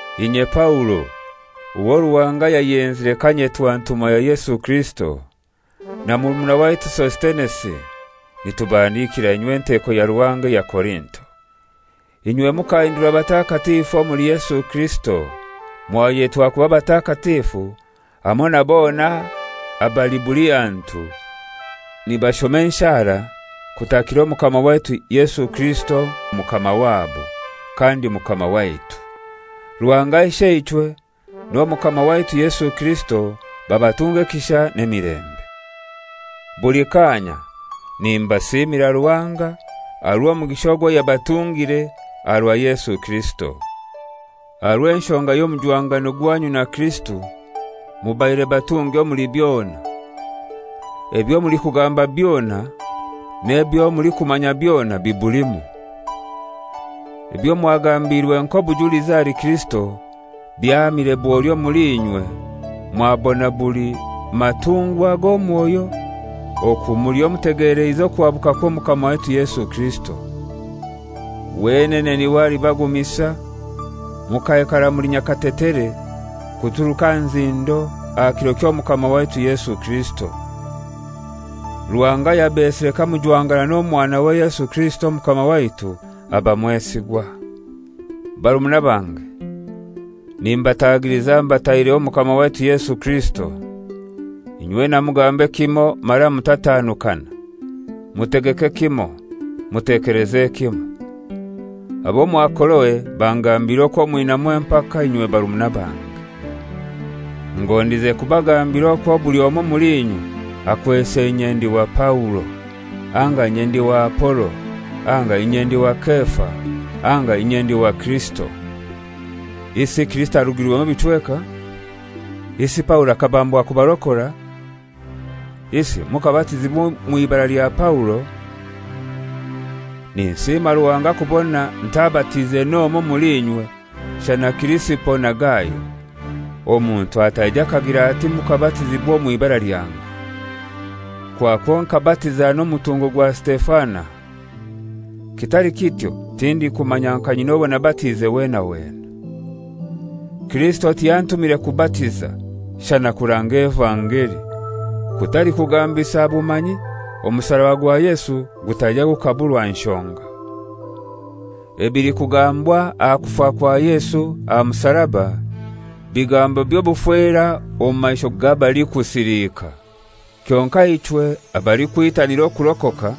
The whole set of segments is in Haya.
Inye Paulo, owo Ruhanga yayenzire kanyetwa ntumwa ya Yesu Kirisito, na murumuna waitu Sositenesi, nitubahandikira inywe enteko ya Ruhanga eya Korinto. Inywe mukahindurwa batakatifu omuli Yesu Kirisito, mwayetwa kuba batakatifu hamoi na bona abali buli hantu nibashoma enshara kutakira Omukama waitu Yesu Kirisito Mukama, wabo kandi Mukama waitu. Ruhanga Isheichwe n'Omukama waitu Yesu Kirisito babatunge ekisha n'emilembe. Buli kaanya nimbasiimira Ruhanga aha rw'omugisha ogwo yabatungire aha rwa Yesu Kirisito. Aha rw'enshonga y'omujwangano gwanyu na Kirisito mubaire batungi omuli byona, ebyo mulikugamba byona n'ebyo mulikumanya byona bibulimu. Ebyo mwagambiirwe nk'obujulizi ahali Kirisito byahamire bwoli omuli inywe mwabona buli matungwa g'omwoyo, oku muliho mutegeleize okuhabuka kw'Omukama waitu Yesu Kirisito. Wenene n'iwe alibagumisa mukaikara muli nyakatetere kuturuka aha nzindo aha kiro ky'Omukama waitu Yesu Kirisito. Ruhanga ayabesire kamujwangana n'Omwanawe Yesu Kirisito Omukama waitu, aba mwesigwa. Barumuna bange, nimbatagiliza mbataireho Omukama waitu Yesu Kirisito, inywena mugambe kimoi mara mutatanukana. Mutegeke kimoi, mutekeleze kimoi. Ab'omwa Koloe bangambiire okwo mwinamu empaka, inywe barumuna bange. Ngondize kubagambira okwo buli omoi omuli inywe akwese «Inye ndi wa Paulo,» anga, «Inye ndi wa Apolo,» anga, «Inye ndi wa Kefa,» anga, «Inye ndi wa Kirisito.» Isi Kirisito arugirwemu ebichweka? Isi Paulo akabambwa kubarokora? Isi mukabatizibwa omw'ibara lya Paulo? Ninsiima Ruhanga kubona ntabatiize n'omoi omuli inywe shana Kirisipo na Gayo; omuntu ataija akagira ati mukabatizibwa omw'ibara lyange. (Kwakwo nkabatiza n'omutungo gwa Sitefana. Kitali kityo tindikumanya nka nyina owo nabatiize wena wena.) Kirisito tiyantumire kubatiza shana kuranga evangeli, kutali kugambisa bumanyi, omusaraba gwa Yesu gutaija gukaburwa nshonga. Ebilikugambwa aha kufa kwa Yesu aha musaraba, bigambo by'obufera omu maisho g'abalikusiliika. Kyonkai ichwe abalikwitanira okurokoka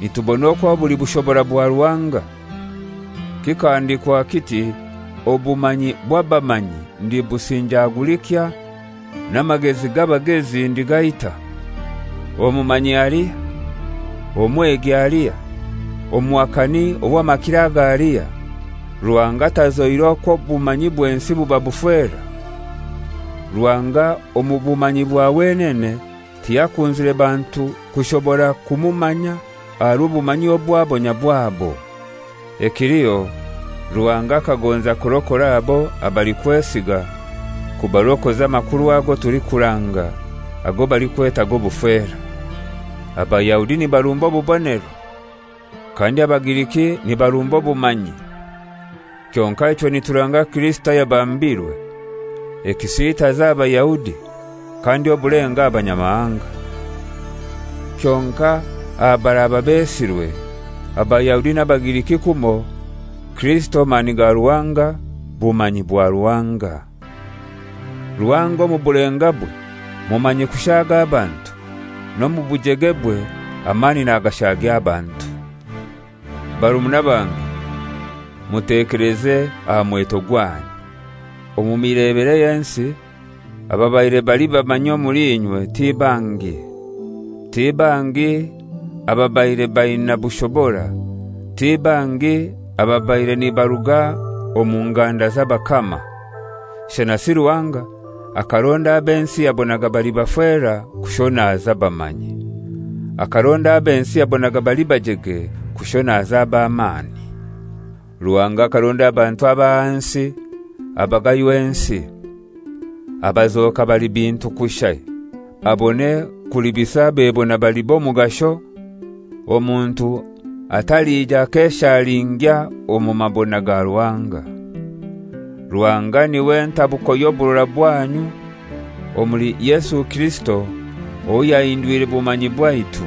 nitubona okwo buli bushobora bwa Ruhanga. Kikahandikwa kiti, «Obumanyi bw'abamanyi ndibusinjagulikya, n'amagezi g'abagezi ndigaita.» Omumanyi alihai? Omwegi alihai? Omuhakani ow'amakiro aga alihai? Ruhanga tazoire okwo obumanyi bw'ensi buba bufera? Ruhanga omu bumanyi bwa wenene tiyakunzire bantu kushobora kumumanya aha rw'obumanyi obwabo nyabwabo. Ekiliho Ruhanga akagonza kurokora abo abalikwesiga, kubarokoza amakuru ago tulikuranga ago balikweta «G'obufera.» Abayahudi nibarumba obubonero, kandi Abagiriki nibarumba obumanyi. Kyonkai ichwe nituranga Kirisito ayabambirwe, ekisiitazo aha Bayahudi, kandi obulenga aha Abanyamahanga. Kyonkai aha baraaba besirwe, Abayahudi n'Abagiriki kumoi, Kirisito mani ga Ruhanga, bumanyi bwa Ruhanga. Ruhanga omu bulengabwe mumanyi kushaaga abantu. N'omu bujegebwe amani nagashagya abantu. Barumuna bange, mutekeleze aha mweto gwanyu. Omu mibere y'ensi ababaire bali bamanyi omuli inywe ti bangi, ti bangi ababaire baina bushobora, ti bangi ababaire nibaruga omu nganda z'abakama. Shanasi Ruhanga akaronda ab'ensi yabonaga bali bafera kushonaza abamanyi. Akaronda ab'ensi yabonaga bali bajege kushonaza ab'amani. Ruhanga akaronda abantu ab'ahansi abagaywa ensi, abazoka bali bintu kushai, abone kulibisa abebona bali b'omugasho, omuntu atalija akeshalingya omu mabona ga Ruhanga. Ruhanga n'iwe ntabuko y'oburora bwanyu omuli Yesu Kirisito owo yahindwire bumanyi bwaitu,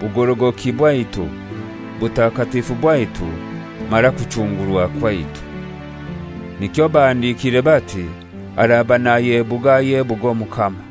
bugorogoki bwaitu, butakatifu bwaitu mara kuchungurwa kwaitu. Nikyo bahandikire bati, «Araba nayebuga ayebuge Omukama.»